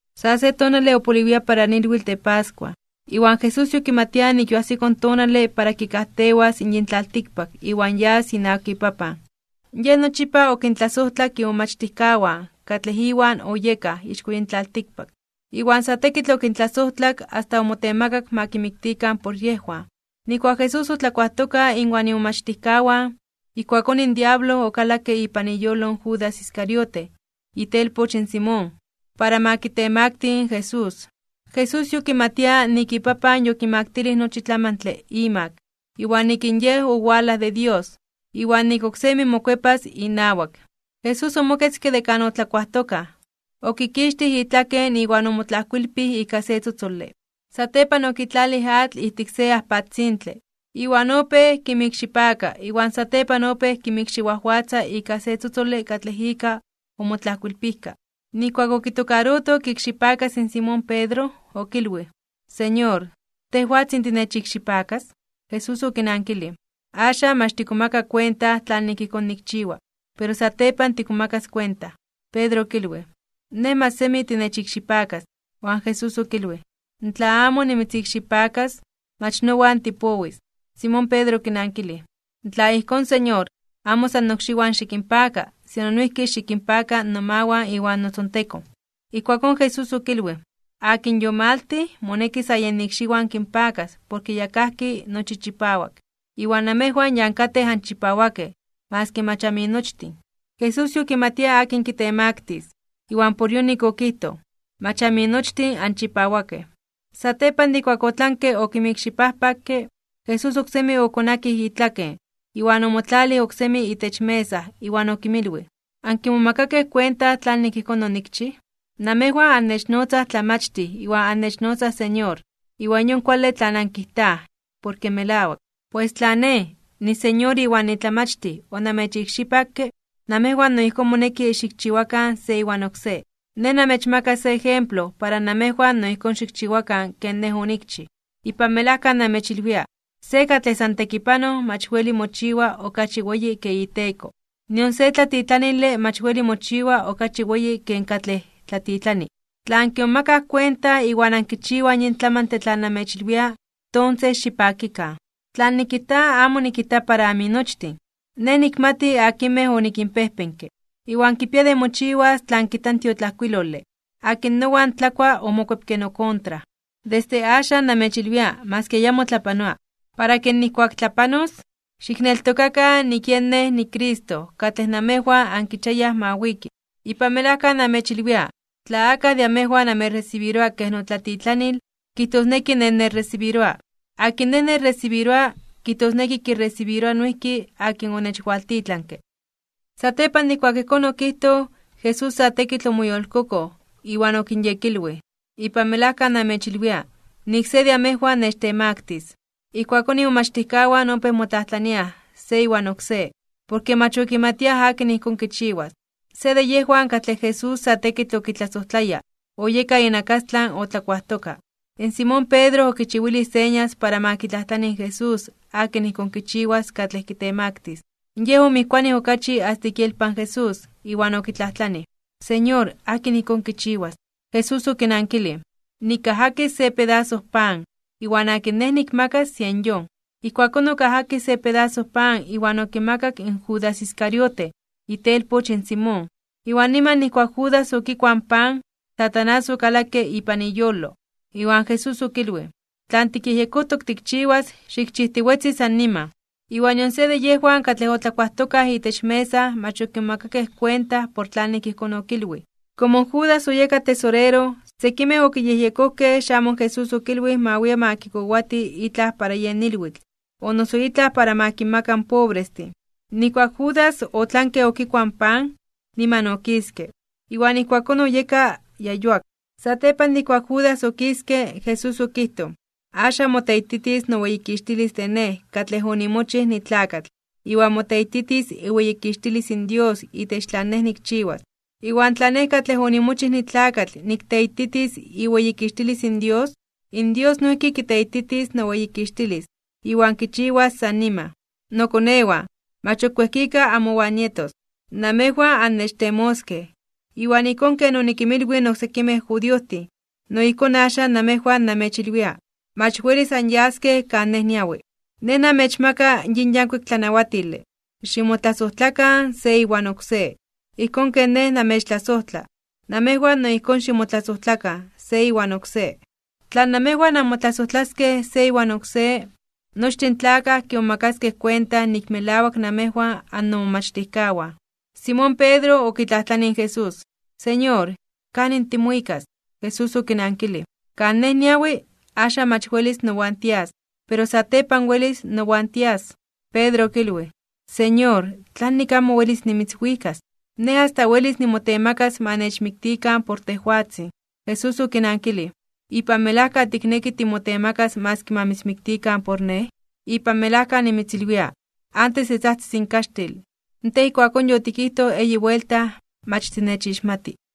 Sa se tonale opoliwia para ilwitl de pascua. Iwan Jesús yokimatia nik yoajsiko in tonale para kikajtewas yin tlaltikpak iwan yas inawak iPapan. Yej nochipa okintlasojtlak imomachtijkawan katlej Iwan oyekaj ixko yin tlaltikpak. Iwan sa tekitl okintlasojtlak asta omotemakak ma kimiktikan por yejwan. Nijkuak in Jesús otlakuajtoka inwan imomachtijkawan, ijkuakón in diablo okalakke ipan iyolo in Judas Iscariote, itelpoch in Simón, para ma kitemakti (ma kitemaktili) in Jesús. Jesús yokimatia nik iPapan yokimaktilij nochi tlamantle imak, iwan nik in Yej owalaj de Dios, iwan nik oksemi mokuepas inawak. Jesús omoketzke de kan otlakuajtokaj, okikixtij itlaken iwan omotlajkoilpij ika se tzotzole. Satepan okitlalij atl ijtik se ajpatzintle, iwan opéj kinmikxipaka iwan satepan opéj kinmikxiwajwatza ika se tzotzole katlej ika omotlajkoilpijka. Nijkuak okitokaroto kiikxipakas in Simón Pedro, okilwij: ―Señor, ¿tejwatzin tinechikxipakas? Jesús okinankilij: ―Axan mach tikmomaka kuenta tlanik ijkón nikchiwa, pero satepan tikmomakas kuenta. Pedro okilwij: ―Nej mach semi tinechikxipakas. Iwan Jesús okilwij: ―Tla amo nimitzikxipakas, mach nowan tipowis. Simón Pedro okinankilij: ―Tla ijkón, Señor, amo san nokxiwan xikinpaka, sino noijki xikinpaka nomawan iwan notzontekon. Ijkuakón Jesús okilwij: ―Akin yomaltij, moneki sa yen ikxiwan kinpakas porke ya kajki nochi chipawak. Iwan namejwan ya ankatej anchipawakej maski mach aminochtin. Jesús yokimatia akin kitemaktis (kitemaktilis), iwan por yonik okijtoj: “Mach aminochtin anchipawakej.” Satepan de ijkuak otlanke okinmikxipajpakke, Jesús oksemi okonakij itlaken, iwan omotlalij oksemi itech mesa iwan okinmilwij: ―¿Ankimomakakej kuenta tlanik ijkón onikchij? Namejwan annechnotzaj Tlamachtij iwan annechnotzaj Señor. Iwan yon kuale tlan ankijtaj porke melawak. Pues tla Nej niSeñor iwan niTlamachtij onamechikxipakke, namejwan no ijkón moneki xikchiwakan se iwan oksé. Nej namechmaka se ejemplo para namejwan no ijkón xikchiwakan ken Nej onikchij. Ipan melajka namechilwia, se katlej san tekipanoj mach weli mochiwa okachi weyi ken iteko, nion se tlatitlanile mach weli mochiwa okachi weyi ken katlej tlatitlani. Tla ankimomakaj kuenta iwan ankichiwaj yin tlamantle tlan namechilwia, tonses xipakikan. ’Tlan nikijta amo nikijta para aminochtin. Nej nikmati akinmej onikinpejpenke. Iwan kipia de mochiwas tlan kijta in tiotlajkuilole: “Akin nowan tlakua, omokuepke nokontra.” Desde axan namechilwia maski ayamo tlapanoa, para ke nijkuak tlapanos, xikneltokakan nik yen Nej niCristo katlej namejwan ankichiayaj ma wiki. Ipan melajka namechilwia, tla akaj de amejwan amechresibiroa kej notlatitlanil, kijtosneki Nej nechresibiroa. Akin Nej nechresibiroa, kijtosneki kiresibiroa noijki akin onechwaltitlanke. Satepan de ijkuak ijkón okijtoj, Jesús sa tekitl omoyolkokoj, iwan okinyekilwij: ―Ipan melajka namechilwia, nik se de amejwan nechtemaktis (nechtemaktilis). Ijkuakón imomachtijkawan opéj motlajtlataj se iwan oksé, porke mach okimatiaj akin ijkón kichiwas. Se de yejwan katlej Jesús sa tekitl okitlasojtlaya, oyeka inakastlan otlakuajtoka, in Simón Pedro okichiwilij señas para ma kitlajtlani in Jesús akin ijkón kichiwas katlej kitemaktis. Yej omijkuanij okachi asta ik ielpan in Jesús, iwan okitlajtlanij: ―Señor, ¿akin ijkón kichiwas? Jesús okinankilij: ―Nikajakis se pedaso pan, iwan akin Nej nikmakas, yen yon. Ijkuakón okajakij se pedaso pan iwan okimakak in Judas Iscariote, itelpoch in Simón. Iwan niman nijkuak Judas okikuaj in pan, in Satanás okalakke ipan iyolo. Iwan Jesús okilwij: ―Tlan tikyejyekojtok tikchiwas, xikchijtiwetzi san niman. Iwan nion se de yejwan katlej otlakuajtokaj itech mesa mach okimomakakej kuenta por tlanik ijkón okilwij. Komo in Judas oyeka tesorero, sekimej okiyejyekojkej xamo in Jesús okilwij ma wia ma kikowati itlaj para yen ilwitl, o noso itlaj ma kinmaka in pobrestin. Nijkuak in Judas otlanke okikuaj in pan, niman okiske. Iwan ijkuakón oyeka ya yuak. Satepan de ijkuak in Judas okiske, in Jesús okijtoj: ―Axan moteititis noweyikixtilis de Nej katlej onimochij nitlakatl, iwan moteititis iweyikixtilis in Dios itech tlan Nej nikchiwas. Iwan tla Nej katlej onimochij nitlakatl nikteititis iweyikixtilis in Dios, in Dios noijki kiteititis noweyikixtilis. Iwan kichiwas san niman. Nokonewan, mach ok wejkika amowan nietos. Namejwan annechtemoskej, iwan ijkón ken onikinmilwij in oksekimej judiojtin, no ijkón axan namejwan namechilwia: Mach welis anyaskej kan Nej niawi. Nej namechmaka yin yankuik tlanawatile: Ximotlasojtlakan se iwan oksé. Ijkón ken Nej namechtlasojtla, namejwan no ijkón ximotlasojtlakan se iwan oksé. Tla namejwan amotlasojtlaskej se iwan oksé, nochtin in tlakaj kimomakaskej kuenta nik melawak namejwan annomomachtijkawan. Simón Pedro okitlajtlanij in Jesús: ―Señor, ¿kanin timuikas? Jesús okinankilij: ―Kan Nej niawi, axan mach welis nowan tias, pero satepan welis nowan tias. Pedro okilwij: ―Señor, ¿tlanik amo welis nimitzwikas? Nej asta welis nimotemakas ma nechmiktikan por tejwatzin. Jesús okinankilij: ―¿Ipan melajka tikneki timotemakas maski ma mitzmiktikan por Nej? Ipan melajka nimitzilwia, antes de tzajtzis in kaxtil, tej ijkuakón yotikijtoj eyi buelta mach tinechixmati.